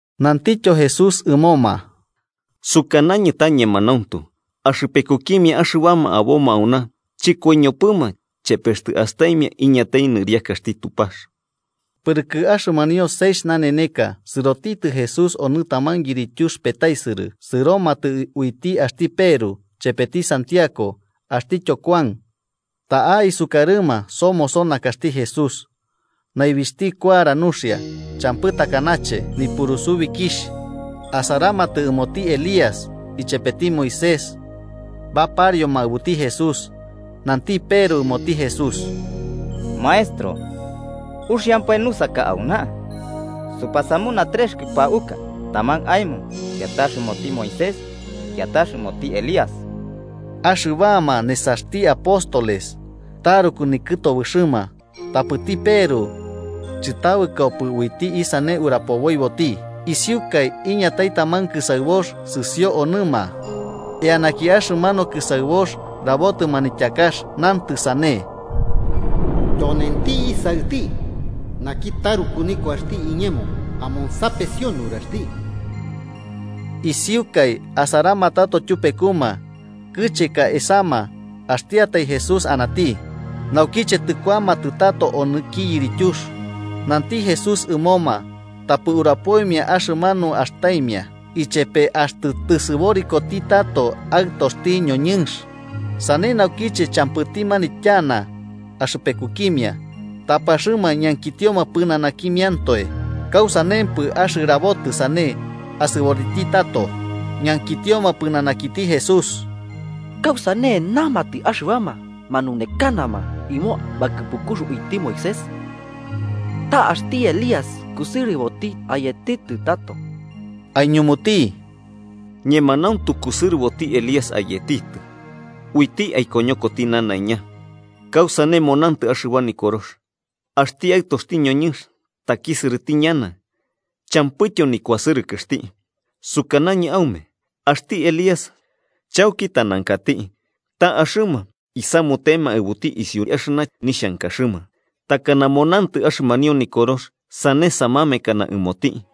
Nantityo Jesús ɨmoma: –Sukanañɨ ta ñemanauntu, axɨpekukimia axɨbama aboma auna chɨkoiñopɨma chepe axtɨ astaimia iñatai niriakaxti Tupax. Pɨrɨkɨ axɨmanio seixh naneneka, sɨrotitɨ Jesús onɨ taman yirityux petaisɨrɨ sɨromatɨ uiti axti Peru, chepeti Santiago axtityo Kuan. Ta'a, isukarɨma, somoso nakaxti Jesús. Naibixhti kuara nuxia, champɨ takanache nipurusubikixh. Asaramatɨ ɨmoti Elías ichepeti Moisés, baparioma aɨbuti Jesús. Nanti Peru ɨmoti Jesús: –Maestro, ¡uxiampae nusaka auna! Supasamuna trex kɨpauka: taman aemo, kiatax ɨmoti Moisés kiatax ɨmoti Elías. Axɨbama nesaxti apóstoles taruku nikɨtobɨxɨma, tapɨti Peru chɨtabɨkopɨ uiti isane urapoboiboti. Isiukai, iñatai taman kɨsaɨbox sɨsio onɨma. Eanaki axɨmanu kɨsaɨbox rabotɨ manityakax, nantɨ sane: “Tyonenti Isaɨti naki taruku nikuaxti iñemo: Amonsapesio nuraxti.” Isiukai, asaramatato tyupekuma, kɨcheka esama, axtiatai Jesús anati. Naukiche tɨkuamatɨ tato onɨki yirityux, nanti Jesús ɨmoma tapɨ urapoimia axɨmanu astaimia, ichepe axtɨ tɨsɨborikoti tato Aɨtoxti noñɨnx. Sane naukiche champɨti manityana axɨpekukimia, tapɨ axɨma ñankitioma pɨnanakimiantoe kausanempɨ axɨrabotɨ sane asɨboriti tato. Ñankitioma pɨnanakiti Jesús: –¿Kausane namatɨ axɨbama manunekanama ɨmo bakɨpukux uiti Moisés ta axti Elías kusɨrɨboti ayetitɨ tato? Aiñumuti: –Ñemanauntu kusɨrɨboti Elías ayetitɨ, uiti aikoñokoti nanaiña. ¿Kausane monantɨ axɨba Nikorox axti Aɨtoxti noñɨnx takisɨrɨti ñana champɨityo nikuasɨrɨkɨxti? Sukanañɨ aume axti Elías chauki tanankati, ta axɨma isamutema aɨbuti isiu axɨna nixhankaxɨma, takana monantɨ axɨmanio Nikorox sane samamekana ɨmoti.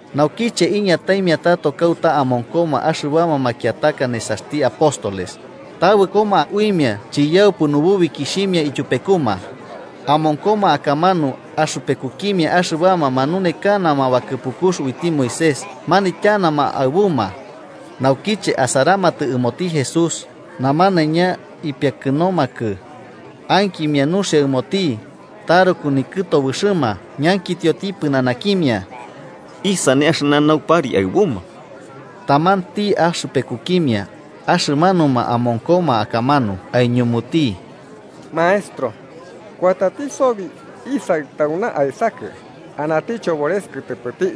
Naukiche iñataimia tato kauta amonkoma axɨbama makiataka nesaxti apóstoles, tabɨkoma uimia chiyaupɨ nububikixhimia ityupekuma, amonkoma akamanu axɨpekukimia axɨbama manunekanama bakɨpukux uiti Moisés manityanama aɨbuma. Naukiche asaramatɨ ɨmoti Jesús, namanaiña ipiakɨnomakɨ ankimia nuxia ɨmoti taruku nikɨtobɨxɨma. Ñankitioti pɨnanakimia: –¿Isane axɨna naupari aɨbuma? Tamanti axɨpekukimia axɨmanuma amonkoma akamanu aiñumuti: –Maestro, kuatati sobi isaɨ tauna aesakɨ, anati chobores kɨtɨpɨti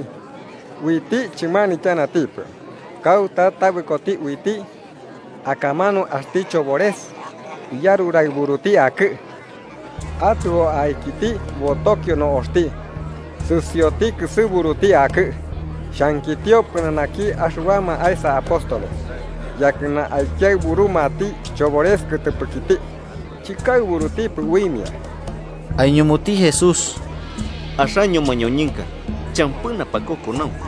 uiti chɨmanityanatipɨ. Kauta tabɨkoti uiti, akamanu axti chobores iyaruraɨburuti akɨ. Atɨo aikiti, botokio no'oxti sɨsioti kɨsɨburuti akɨ'ɨ. Xhankitio pɨnanaki axɨbama aesa apóstoles yakɨna aikiaɨburumati chobores kɨtɨpɨkiti, chɨkaɨburutipɨ uimia. Aiñumuti Jesús: –¡Axaño mañoñɨnka champɨ napakokonaunku!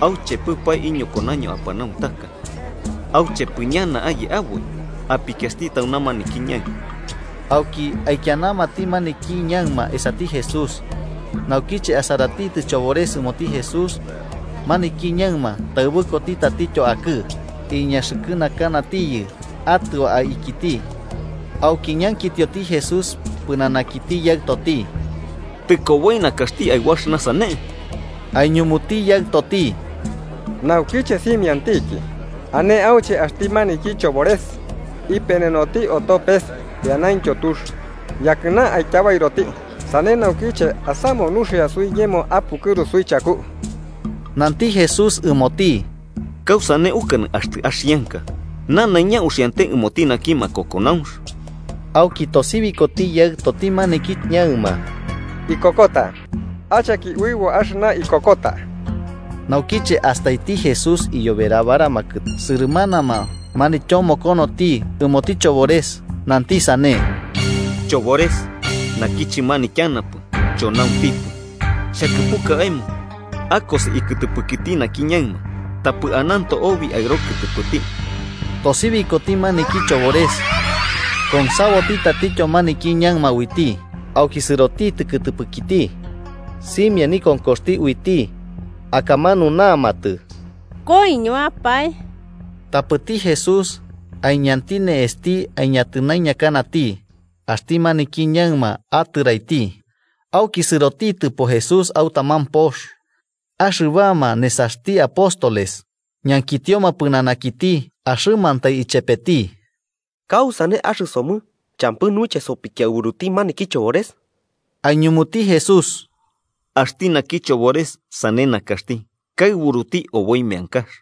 ¿Auchepɨpae iñokonaño apanauntaka? ¿Auchepɨ ñana aye aboi? Apikiasti tauna maniki ñaɨma. Auki aikianamati maniki ñaɨma esati Jesús. Naukiche asaratitɨ chobores ɨmoti Jesús, maniki ñaɨma, taɨbɨkoti tatityo akɨ iñaxɨkɨnakanatiyɨ atɨo aikiti. Auki ñankitioti Jesús pɨnanakiti yaɨtoti: –¿Tɨ koboi nakaxti aɨbu axɨna sane? Aiñumuti yaɨtoti: –Naukiche simiantiki. Ane auche axti maniki chobores ipenenoti oto pes eanaintyo tux, yakɨna aityabairoti. Sane naukiche asamu nuxia suiñemo apukɨru suichaku. Nanti Jesús ɨmoti: –¿Kausane ukanɨ ‘axtɨ axianka’? ¡Nanaiña uxiante ɨmoti naki makokonaunx! Auki atosibiti yaɨtoti maniki ñaɨma: –Ikokota. ¡Acheki uɨbo axɨna ikokota! Naukiche astaiti Jesús iyoberabaramakɨ sɨrɨmanama, manityomokonoti ɨmoti chobores, nanti sane: –Chobores naki chɨmanityanapɨ, chonauntipɨ, xhakɨpuka aemo akosi ikɨtɨpɨkiti naki ñaɨma tapɨ ananto obi aɨro kɨtɨpɨti. Tosibikoti maniki chobores, konsaboti tatityo maniki ñaɨma uiti. Auki sɨrotitɨ kɨtɨpɨkiti, simia nikonkoxti uiti akamanu namatɨ, koiñotiapae. Tapɨti Jesús, aiñenti ne'esti, aiñatɨnaiñakanati. Axti maniki ñaɨma atɨraiti. Auki sɨrotitɨpo Jesús au taman pox, axɨbama nesaxti apóstoles ñankitioma pɨnanakiti axɨmantai ichepeti: –¿Kausane axɨsomɨ champɨ nuiche sopikiaɨburuti maniki chobores? Aiñumuti Jesús: –Axti naki chobores sane nakaxti, kaɨburuti oboi meankax.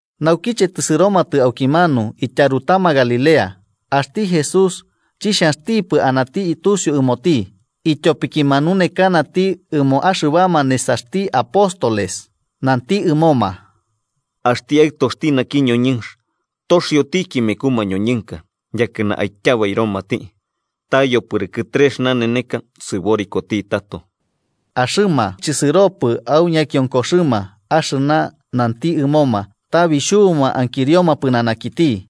Naukiche tɨsɨromatɨ aukimanu, ityarutama Galilea. Axti Jesús chixhanxtipɨ anati tusiu ɨmoti, ityopiki manunekanati ɨmo axɨbama nesaxti apóstoles. Nanti ɨmoma: –Axti Aɨtoxti naki noñɨnx toxiotiki meku mañoñɨnka, yakɨna aityabairomati. Ta yopɨrɨkɨ trex naneneka sɨborikoti tato. Axɨma chisɨropɨ au ñakionkoxɨma axɨna nanti ɨmoma, ta bixhubuma ankirioma pɨnanakiti.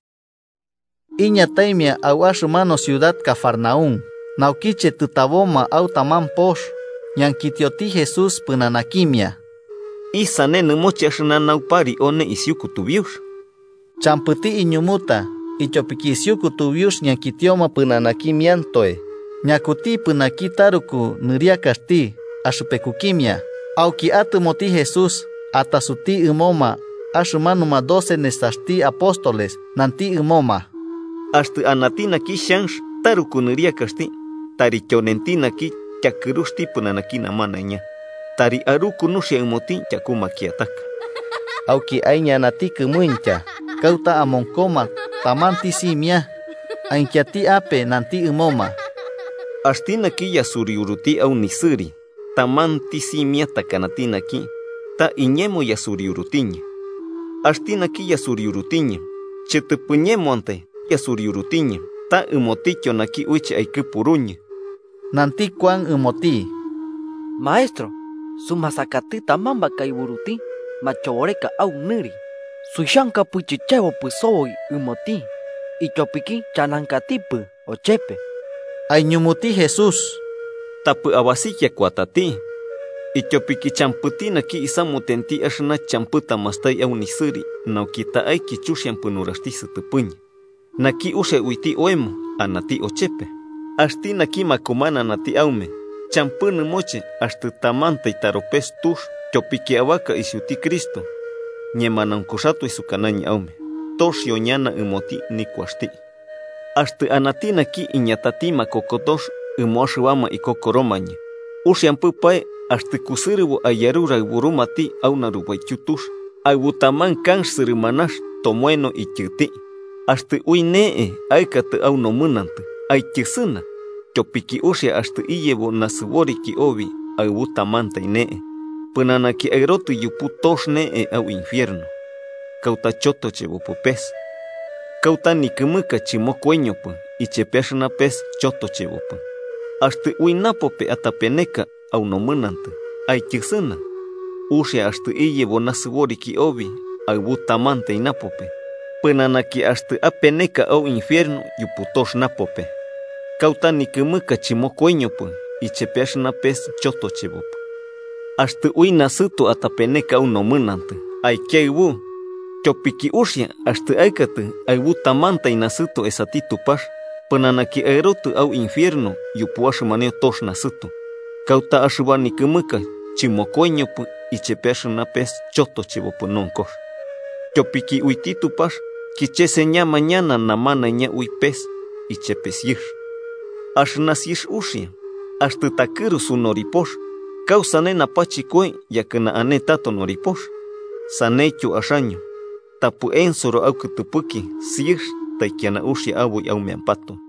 Iñataimia au axɨmanu ciudad Cafarnaún. Naukiche tɨtaboma au taman pox, ñankitioti Jesús pɨnanakimia: –¿Isane nɨmoche axɨna naupari one isiu kutubiux? Champɨti iñumuta, ityopiki isiu kutubiux ñankitioma pɨnanakimiantoe ñakutipɨ naki taruku nɨriakaxti axɨpekukimia. Auki atɨmoti Jesús, atasuti ɨmoma axɨmanuma doce nesaxti apóstoles, nanti ɨmoma: –Axtɨ anati naki xhanx taruku nɨriakaxti, tari tyonenti naki tyakɨruxti pɨnanaki namanaiña tari aruku nuxia ɨmoti tyaku makiataka. Auki aiñanati kɨmuintya kauta amonkoma tamanti simia, aikianati ape nanti ɨmoma: 37–Axti naki yasuriuruti au nisɨri tamanti simia takanati naki, ta iñemo yasuriurutiñɨ. Axti naki yasuriurutiñɨ, chɨtɨpɨ iñemoantai yasuriurutiñɨ, ta ɨmotityo naki uiche aikɨpuruñɨ. Nanti Kuan ɨmoti: –Maestro, sumasakati taman bakaɨburuti machoboreka au nɨri, suixhankapɨ chichebopɨ soboi ɨmoti, ityopiki chanankatipɨ ochepe. Aiñumuti Jesús: –Tapɨ abasikia kuatati, ityopiki champɨti naki isamutenti axɨna champɨ tamastai au nisɨri nauki ta'aiki chuxiampɨ nuraxti sɨtɨpɨñɨ. Naki uxia uiti oemo, anati ochepe. Axti naki makumananati aume champɨ nɨmoche axtɨ tamantai taropes tux tyopiki abaka isiuti Cristo, ñemanaunkuxatoe sukanañɨ aume, toxio ñana ɨmoti nikuaxti. “Axtɨ anati naki iñatati makokotox ɨmo axɨbama ikokoromañɨ, uxiampɨpae axtɨ kusɨrɨbo aiyaruraɨburumati au narubaityu tux aɨbu taman kanx sɨrɨmanax tomoeno ityɨti. Axtɨ ui ne'e aɨkatɨ au nomɨnantɨ, aityɨsɨna. Tyopiki uxia axtɨ iyebo nasɨboriki obi aɨbu tamantai ne'e, pɨnanaki aɨrotɨ yupu tox ne'e, au infierno, kauta chotochebopɨ pes, kauta nikɨmɨka chɨmokoiñopɨ ichepe axɨna pes chotochebopɨ. Axtɨ ui napope atapeneka au nomɨnantɨ, aityɨsɨna. Uxia axtɨ iyebo nasɨboriki obi aɨbu tamantai napope, pɨnanaki axtɨ apene au infierno yupu tox napope, kauta nikɨmɨka chɨmokoiñopɨ ichepe axɨna pes chotochebopɨ. Axtɨ ui nasɨto atapeneka au nomɨnantɨ, aikiaɨbu. Tyopiki uxia axtɨ aɨkatɨ aɨbu tamantai nasɨto esati Tupax, pɨnanaki aerotɨ au infierno yupu axɨmanio tox nasɨto, Kauta axɨba nikɨmɨka chɨmokoiñopɨ ichepe axɨna pes chotochebopɨ nonkox. “Tyopiki uiti Tupax kicheseñama ñana namanaiña ui pes ichepe siɨx. Axɨna siɨx uxia. Axtɨ takɨrusu noripox, ¿kausane napachɨkoi yakɨna ane tato noripox? Saneityo axaño tapɨ ensoro aukɨtɨpɨki siɨx taikiana uxia aboi aumeampatoe.”